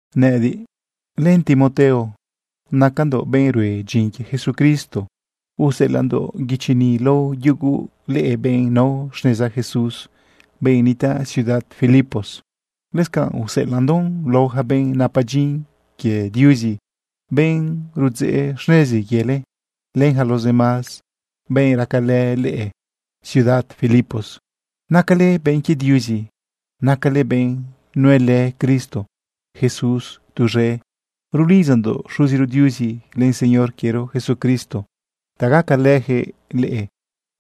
Nëꞌëdiꞌ len Timoteo, nacandoꞌ benꞌ rue dyin quie Jesucristo. Useꞌelaꞌndoꞌ guichi ni lao yugu leꞌe benꞌ nao xneza Jesús, benꞌ nitaꞌ ciudad Filipos. Lëscanꞌ useꞌelaꞌndoꞌn lao yaca benꞌ napa dyin quie Diuzi, benꞌ rudzeꞌ xnezi quiele, len yaca los demás benꞌ racalë leꞌe ciudad Filipos. Nacale benꞌ quie Diuzi, nacale benꞌ nuelë Cristo Jesús tuz̃e. Rulidzandoꞌ Xuziro Diuzi len Señor quiero Jesucristo ta gacalëjëꞌ leꞌe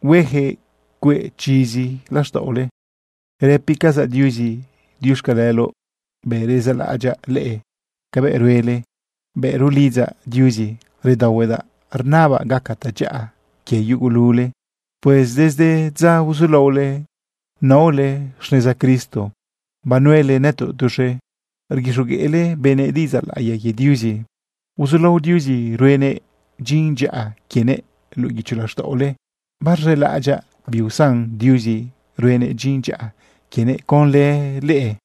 huejëꞌ cueꞌ chizi laxtaꞌole. Rëpicazaꞌ Diuzi “diuxcaleloꞌ” bëꞌ rezaꞌlaꞌadyaꞌ leꞌe cabëꞌ ruele. Bëꞌ rulidzaꞌ Diuzi redaohuedaꞌ rnabaꞌ gaca tadyaꞌa quie yugulule. Pues desde dza uzulaole inaole xneza Cristo, banuelë nëtoꞌ tuz̃e rguixogueꞌle benëꞌ diꞌidzaꞌ laꞌiya quie Diuzi. Uzulao Diuzi ruenëꞌ dyin dyaꞌa quienëꞌ luꞌu guicho laxtaꞌole. Barz̃elaꞌadyaꞌ biusan Diuzi ruenëꞌ dyin dyaꞌa quienëꞌ conlë leꞌe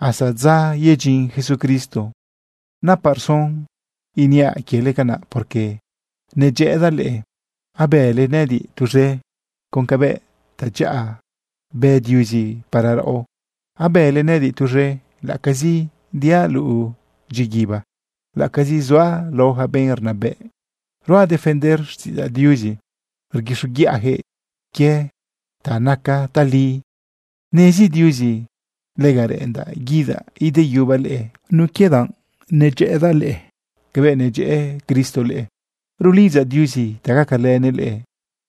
hasta dza yedyin Jesucristo. Napaꞌ rson iniaꞌ quiele canaꞌ, porque nedyëꞌëdaꞌ leꞌe. Abële nëꞌëdiꞌ tuz̃e con cabëꞌ tadyaꞌa bë Diuzi para raꞌo. Abële nëꞌëdiꞌ tuz̃e laꞌacazi diaꞌ luꞌu dyiguiba, laꞌacazi zuaꞌ lao yaca benꞌ rnabëꞌ ruaꞌ defender xtiꞌidzaꞌ Diuzi rguixoguiꞌayaquëꞌ quie ta naca tali. Nezi Diuzi lega reꞌendaꞌ guidaꞌ ideyubaꞌ leꞌe nun quie danꞌ nedyëꞌëdaꞌ leꞌe cabëꞌ nedyëꞌë Cristo leꞌe. Rulidzaꞌ Diuzi ta gacalënëꞌ leꞌe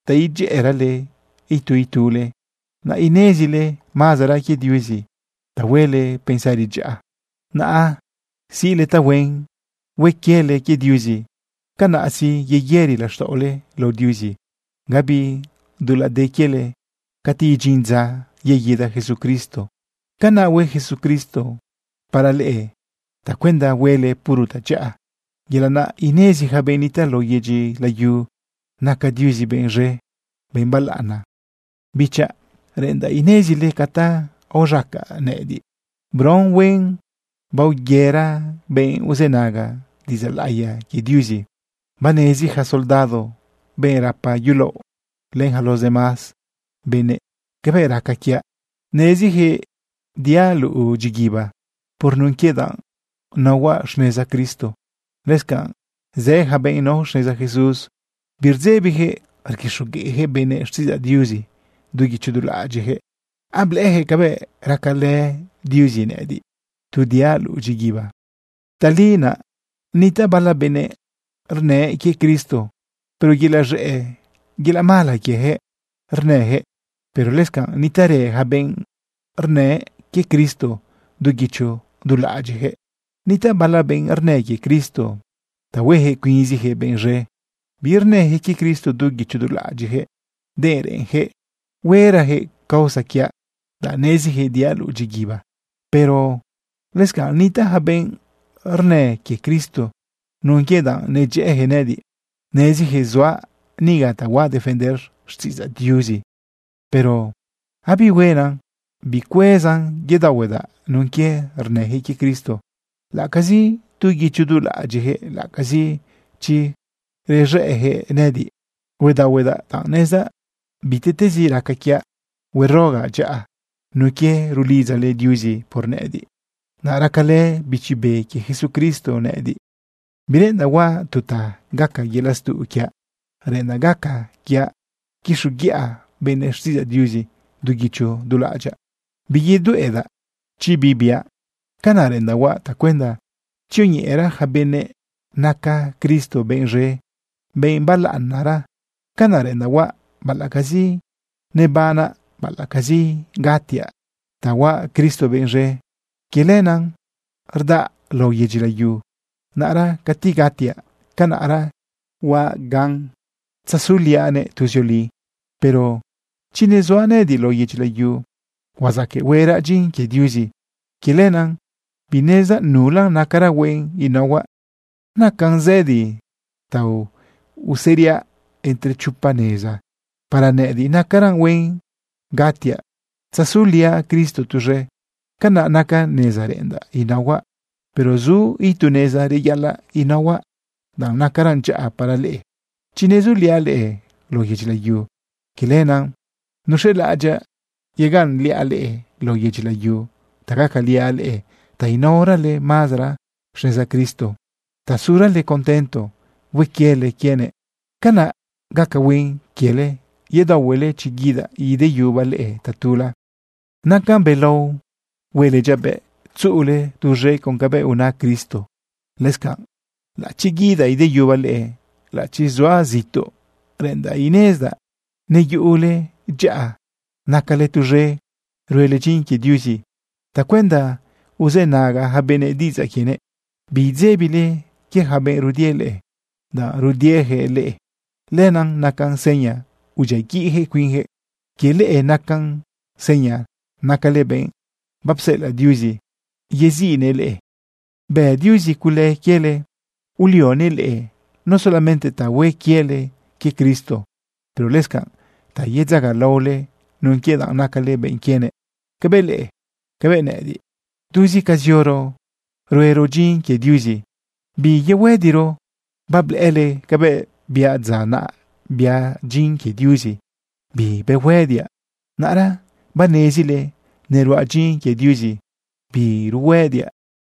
ta idyëꞌërale itu itule, naꞌ inezile mazara quie Diuzi ta huele pensari dyaꞌa, naꞌ siꞌle tahuen, hue quiele quie Diuzi. Canaꞌ sí, yeyëri laxtaꞌole lao Diuzi, gabi dulaꞌ de quiele cati idyin dza yeguida Jesucristo. Canaꞌ hue Jesucristo para leꞌe tacuenda huele puro tadyaꞌa, yelaꞌ naꞌ inezi yaca benꞌ nitaꞌ lao yedyi layu naca Diuzi benꞌ z̃e, benꞌ balaꞌana. Bichaꞌ, reꞌendaꞌ inezile ca ta aoz̃acaꞌ nëꞌëdiꞌ bron huen, baoyëra benꞌ uzënaga diꞌidzaꞌ laꞌiya quie Diuzi. Banezi yaca soldado, benꞌ rapa yulaoꞌ, len yaca los demás benëꞌ, cabëꞌ raca quiaꞌ. Nezijëꞌ diaꞌ luꞌu dyiguiba por nun quie danꞌ naohuaꞌ xneza Cristo. Lëscanꞌ zë yaca benꞌ nao xneza Jesús, birdzebiyaquëꞌ rguixogueꞌyaquëꞌ benëꞌ xtiꞌidzaꞌ Diuzi du guicho du laꞌadyiꞌyaquëꞌ. Ablëꞌëyaquëꞌ cabëꞌ racalë Diuzi nëꞌëdiꞌ, tu diaꞌ luꞌu dyiguiba. Tali naꞌ nitaꞌ bala benꞌ rnë quie Cristo, pero yelaꞌ z̃ëꞌ, yelaꞌ mala quieyaquëꞌ rnëyaquëꞌ. Pero lëscanꞌ nitaꞌrë yaca benꞌ rnë quie Cristo du guicho du laꞌadyiꞌyaquëꞌ. Nitaꞌ bala benꞌ rnë quie Cristo ta huejëꞌ cuinzijëꞌ benꞌ z̃e. Birnëyaquëꞌ quie Cristo du guicho du laꞌadyiꞌyaquëꞌ, denꞌ reꞌenyaquëꞌ huerayaquëꞌ causa quiaꞌ, danꞌ neziyaquëꞌ diaꞌ luꞌu dyiguiba. Pero lëscanꞌ nitaꞌ yaca benꞌ rnë quie Cristo nun quie danꞌ nedyëꞌëyaquëꞌ nëꞌëdiꞌ. Neziyaquëꞌ zuaꞌ niga ta huaꞌ defender xtiꞌidzaꞌ Diuzi. Pero abihuena. Bicuezan yedaohuedaꞌ nun quie rnëjëꞌ quie Cristo, laꞌacazi du guicho du laꞌadyiꞌyaquëꞌ, laꞌacazi chi rez̃ëꞌyaquëꞌ nëꞌëdiꞌ. Huedaohuedaꞌ danꞌ nezdaꞌ bitiꞌtezi raca quiaꞌ, huarogaꞌ dyaꞌa nun quie rulidzale Diuzi por nëꞌëdiꞌ, naꞌ racalë Bichi Be quie Jesucristo nëꞌëdiꞌ. Bireꞌendaꞌ huaꞌ tu ta gaca yelaꞌ stuꞌ quiaꞌ. Reꞌendaꞌ gaca quiaꞌ quixoguiꞌa benëꞌ xtiꞌidzaꞌ Diuzi du guicho du laꞌadyaꞌ, biyedueꞌdaꞌ chi bi biaꞌ. Canaꞌ reꞌendaꞌ huaꞌ tacuenda tzioñeꞌera yaca benëꞌ naca Cristo benꞌ z̃e, benꞌ balaꞌanara. Canaꞌ reꞌendaꞌ huaꞌ baꞌalaꞌcazi nebanaꞌ, baꞌalaꞌcazi gatiaꞌ. Ta huaꞌ Cristo benꞌ z̃e, quie lenaꞌ rdaꞌa lao yedyi layu. Naꞌra cati gatiaꞌ, canaꞌra biaꞌ gan tzazuliaꞌnëꞌ tuzioli. Pero chi nezuaꞌ nëꞌëdiꞌ lao yedyi layu, huazaqueꞌ hueraꞌ dyin quie Diuzi. Quie lenaꞌ binezdaꞌ nulan nacaran huen inaohuaꞌ. Nacan zëdi ta useriaꞌ entre chopa neza. Para nëꞌëdiꞌ nacaran huen gatiaꞌ tzazuliaꞌ Cristo tuz̃e. Canaꞌ naca neza reꞌendaꞌ inaohuaꞌ. Pero zu itu neza reyaꞌalaꞌ inaohuaꞌ danꞌ nacaran dyaꞌa para leꞌe chi nezuliaꞌ leꞌe lao yedyi layu. Quie lenaꞌ nuz̃elaꞌadyaꞌ yegaꞌnliaꞌ leꞌe lao yedyi layu ta gacaliaꞌ leꞌe ta inaorale mazara xneza Cristo ta surale contento hue quiele quienëꞌ. Canaꞌ gaca huen quiele yedaohuele chi guidaꞌ ideyubaꞌ leꞌe tatula. Nacan belao huele dyabëꞌ tzuꞌule tuz̃e con cabëꞌ una Cristo. Lëscanꞌ laꞌachi guidaꞌ ideyubaꞌ leꞌe, laꞌachi zuaꞌ zituꞌ, reꞌendaꞌ inezdaꞌ neyuꞌule dyaꞌa, nacale tuz̃e ruele dyin quie Diuzi tacuenda uzënaga yaca benëꞌ diꞌidzaꞌ quienëꞌ. Biidzebile quie yaca benꞌ rudie leꞌe. Danꞌ rudieyaquëꞌ leꞌe, lenaꞌ nacan seña udyiaguiꞌyaquëꞌ cuinyaquëꞌ. Quie leꞌe nacan seña nacale benꞌ bapsela Diuzi yeziꞌnëꞌ leꞌe. Bë Diuzi cule quiele ulionëꞌ leꞌe no solamente ta hue quiele quie Cristo, pero lëscanꞌ ta yedzagalaole nun quie danꞌ nacale benꞌ quienëꞌ. Cabëꞌ leꞌe, cabëꞌ nëꞌëdiꞌ, tuzi ca zioro huero dyin quie Diuzi, biyuhëdiro. Bablëꞌële cabëꞌ biaꞌ dza naꞌ biaꞌ dyin quie Diuzi, bibehuëdiaꞌ. Naꞌra banezile neruaꞌ dyin quie Diuzi, biruhuëdiaꞌ.